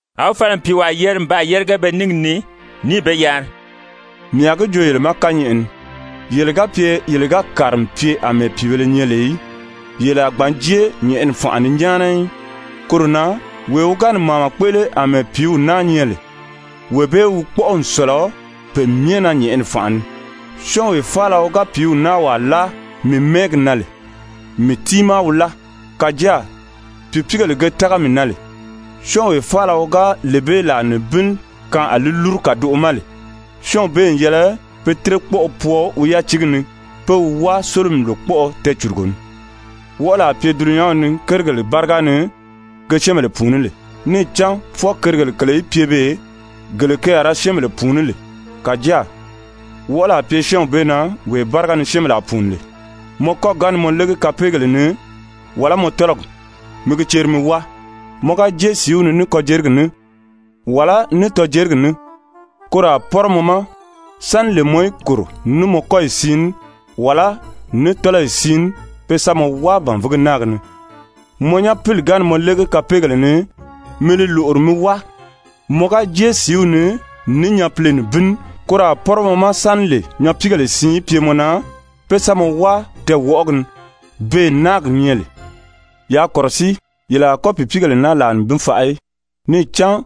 A wi fala n pìiwaa yeri n baa yérige be níngi ni, níì be yari: «Mii a gi joo yele ma kányɛʔɛ ni, yele ga pye yele ga kàri n pye àmɛɛ pìíbèle nyɛ lè í, yele a gbǎn jée nyɛ̀ʔɛni fànʔa ni nyáana í. Koro na, wee wi ga ni màama kpéʔele àmɛɛ pìíw naa nyɛ lè, wee bee wi kpɔ́ʔɔ n sɔ̀lɔ pe myɛ na nyɛ̀ʔɛni fànʔa ni. Syɔ́ɔnwee faala wi ga pìíw naa wàa láa mii mɛ́ɛgi na lè, mii tiimaa wi láa. «Kàjáa pìipiigèle ge tága mii na lè, syɔ́ɔnwee faala wi ga lee bee làa nibin kaan a li lúru kàdoʔo ma lè, syɔ́ɔnw bee n yɛlɛ pe tírekpɔʔɔ pwɔɔ wi yátiigi ni pé wi wáa sólomi lòkpɔʔɔ tɛɛcùrugo ni. Wɔʔɔli a pye dulunyanw ni kérigèle báriga ni ge syɛ́ɛnbèle pùuní lè! Níì cán fwɔɔ kérigèle kèle í pye beè, gele ke a ra syɛ́ɛnbèle pùuní lè. Kàjáa wɔʔɔli a pye syɔ́ɔnw bee na wee báriga ni syɛ́ɛnbèle a pùuni lè. Mɔ kɔ́gi ga ni mɔ légi kapeegèle ni, wàlá mɔ tɔ́lɔgi, mi gi ceri mi wáa. Mɔ ga jée sìíw ni ní kɔjerigi ní, wàlá ní tɔjerigi ní, koro a pɔ́rɔ mɔ ma sáni lè mɔ í kòro ní mɔ kɔ́yi siin ní, wàlá ní tɔ́lɔyi siin ní, pe sa mɔ wáa bànvigi náagi ni. Mɔ nyapili ga ni mɔ légi kapeegèle ni, mi li lòʔori mi wáa. Mɔ ga jée sìíw ni ní nyapile nibin ní, koro a pɔ́rɔ mɔ ma sáni lè nyapiigèlē siin í pye mɔ na pé sa mɔ wáa tɛɛwɔʔɔgi ni, beè náagi nyɛ lè. «Yaa kɔ̀rɔsíi, yele a kɔ́ pìipiigèle naa làa nibin faʔa í, níì cán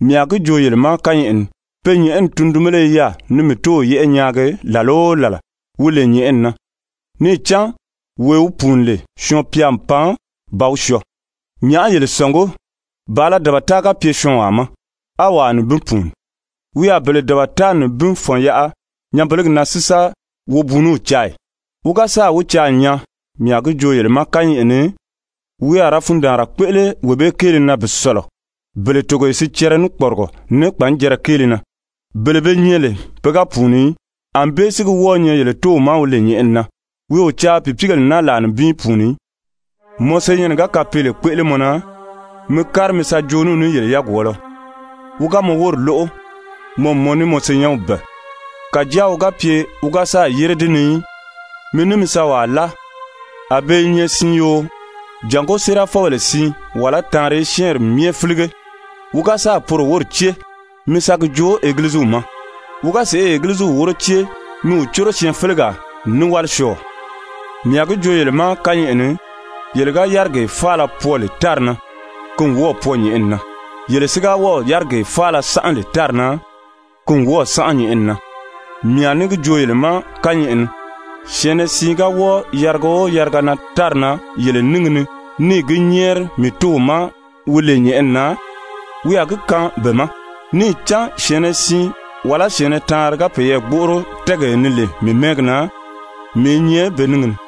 mii a gi joo yele ma kányɛʔɛ ni, pe nyɛ̀ʔɛni tundunbéle i yaà ni mii Tóow yɛ́ʔɛ nyaagi làla o làla, wi lè nyɛ̀ʔɛni na. [ Níì cán wee wi pùuni lè, Syɔɔn-pya n pan ba wi syɔɔ.] Nyàʔá yele sɔ̀ngí? Bàala dabata ga pye syɔɔnwaa ma, á wàa nibin pùuni, wi a bele dabata nibin fɔ̀n yaʔa nyanbelegi na si sa wobuuniw caa ì? Wi ga sáà wi caa n nyaa, mii a gi joo yele ma kányɛʔɛ ni, wi a ra fundaanra kpéʔele wee bee kéele na bi sɔ̀lɔ bele togoye sicɛrɛ ní kpɔrigɔ ní kpanjɛrɛ kéele na, bele be nyɛ lè pe ga pùuni í. Anbée si gi wɔ́ɔ̄ nyɛ yele Tóow ma wi lè nyɛ̀ʔɛni na, wi o caa pìipiigèle naa làa nibin í pùuni í. «Mɔ senyɛnnɛ ga kapeele kpéʔele mɔ na, mi kári mi sa joo ní wi ní yele yagwɔɔlɔ. Wi ga mɔ wóri lóʔo, mɔ n mɔ ní mɔ senyɛnw bɛ̀ɛ. Kàjáa wi ga pye wi ga sáà yére di ni í, mi ní mi sa wàa láa, a be i nyɛ siin yoo, jàngó ‹séerafɔbèle siin, wàlá taanri í syɛ́ɛnri myɛ fílige.› Wi ga sáà poro wóri cée, mi sa gi joo Egiliziw ma. Wi ga sèʔê Egiliziw wóro cée, mi wi córo syɛɛnfelegaawálisyɔɔɔ. «Mii a gi joo yele ma kányɛʔɛ ni, yele ga yárigee faala pwɔɔ lè tári na, ki n wɔ́ɔ̀ pwɔɔ nyɛ̀ʔɛni na, yele si ga wɔ́ɔ̀ yárigee faala sánʔa lè tári na, ki n wɔ́ɔ̀ sánʔa nyɛ̀ʔɛni na. Mii a ní gi joo yele ma kányɛʔɛ ni, syɛ̀ɛnnɛ siin ga wɔ́ɔ yariga o yariga na tári na yele níngi ni, níì gi nyɛ́ɛri mii Tóow ma wi lè nyɛ̀ʔɛni na, wi a gi kaan be ma. Níì cán syɛ̀ɛnnɛ siin, wàlá syɛ̀ɛnnɛ taanri ga peyɛɛ gbóʔoro tɛ́ɛgee ni lè mii mɛ́ɛgi na, mii i nyɛ be níngi ni.»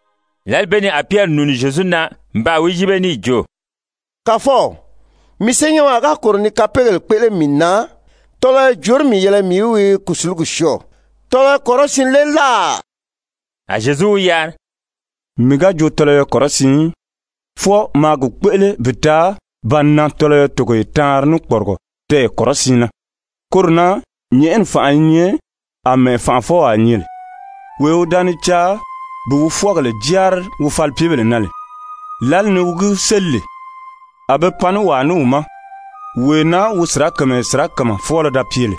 Lǎli bee ni a Pyɛri nùuni Zyezu na n baa wi yíbe níì jo: «Kàfɔw, mii senyɛnwaa ga kòro ni kapeegèle kpéʔele mii na, tɔlɔyɔ jòorí mii yɛlɛ mii í wi kùsulugi syɔɔ? Tɔlɔyɔ kɔrɔsiin lé láà?» A Zyezu wi yari: «Mii ga jo tɔlɔyɔ kɔrɔsiin í, fwɔɔ maa gi kpéʔele bi taa ba nan tɔlɔyɔ togoye taanri ní kpɔrigɔ tɛɛyɛ kɔrɔsiin na. Koro na nyɛ̀ʔɛni fànʔa i nyɛ àmɛɛ fànʔafɔwaa nyɛ lè, wee wi da ni caa bi wi fwɔ́ɔgèle jáari wi falipyebèle na lè. Lǎli ni wi gi séli lè, a be pan ní wàa ní wi ma, wee na wi sirakamayɛ sirakama fwɔ́ɔlɔ da pye lè.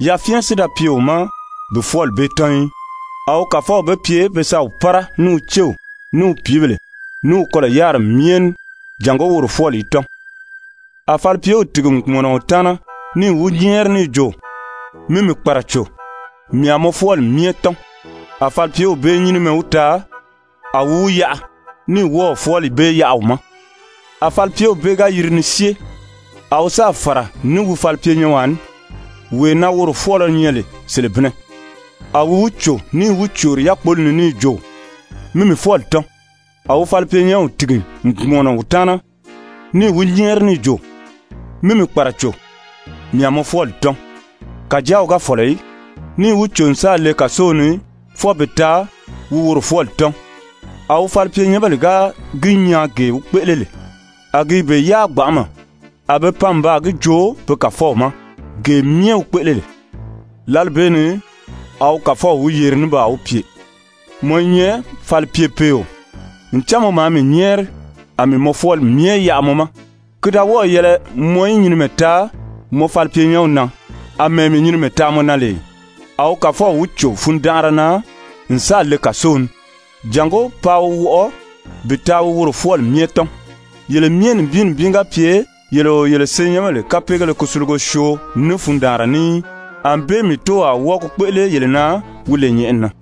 Yafyɛn si da pye wi ma bi fwɔ́ɔli bee tɔ́n í. A wi kàfɔw be pye be sa wi pára ní wi céw, ní wi pìíbèle, ní wi kɔlɔ̀ yáriri myɛ ní jàngó woro fwɔ́ɔli í tɔ́n. A falipyew tìgi n kpùmɔnɔ wi taana níì wi nyɛ́ɛri níì jo: ‹Mi mii kpàraco, mii a mɔ fwɔ́ɔli myɛ tɔ́n.› A falipyew bee nyínimɛ wi taa, a wi wi yaʔa ní wɔ́ɔ̀ fwɔ́ɔli bee yaʔa wi ma. A falipyew bee ga yiri ni syée, a wi sáà fàra ní wi falipyenyɛnwaa ní, wee na woro fwɔ́ɔlɔ nyɛ lè selebinnɛ. A wi wi cò níì wi còri yákpoli ni níì jo: ‹Mi mii fwɔ́ɔli tɔ́n.› A wi falipyenyɛnw tìgi n kpùmɔnɔ wi taana níì wi nyɛ́ɛri níì jo: ‹Mi mii kpàraco, mii a mɔ fwɔ́ɔli tɔ́n.› Kàjáa wi ga fɔ̀lɔ í, níì wi cò n sáà le kàsow ni fwɔɔ bi taa wi woro fwɔ́ɔli tɔ́n. A wi falipyenyɛnbèle ga gi nyaa gee wi kpéʔele lè, a gi i be yáa gbanʔama, a be pan n baa gi joo be kàfɔw ma gee myɛ wi kpéʔele lè. Lǎli bee ni a wi kàfɔw wi yeri ní baa wi pye: ‹Mɔ i nyɛ falipyepeeo, ncan mɔ maa mii nyɛ́ɛri, a mii mɔ fwɔ́ɔli myɛ yaʔa mɔ ma. Ki da wɔ́ɔ̀ yɛlɛ mɔ í nyinimɛ taa mɔ falipyenyɛnw na, àmɛɛ mii nyinimɛ taa mɔ na lè ì?› A wi kàfɔw wi cò fundanʔara na n sáà le kàsow ni, jàngó paa wi wɔʔɔ bi taa wi woro fwɔ́ɔli myɛ tɔ́n. Yele myɛ nibin nibin ga pye yele o yele senyɛnbèle kapeegéle kusulugo syoo ní fundaanra ní í, ànbée mii Tóow a wɔ́ɔ gi kpéʔele yele na wi lè nyɛ̀ʔɛni na.»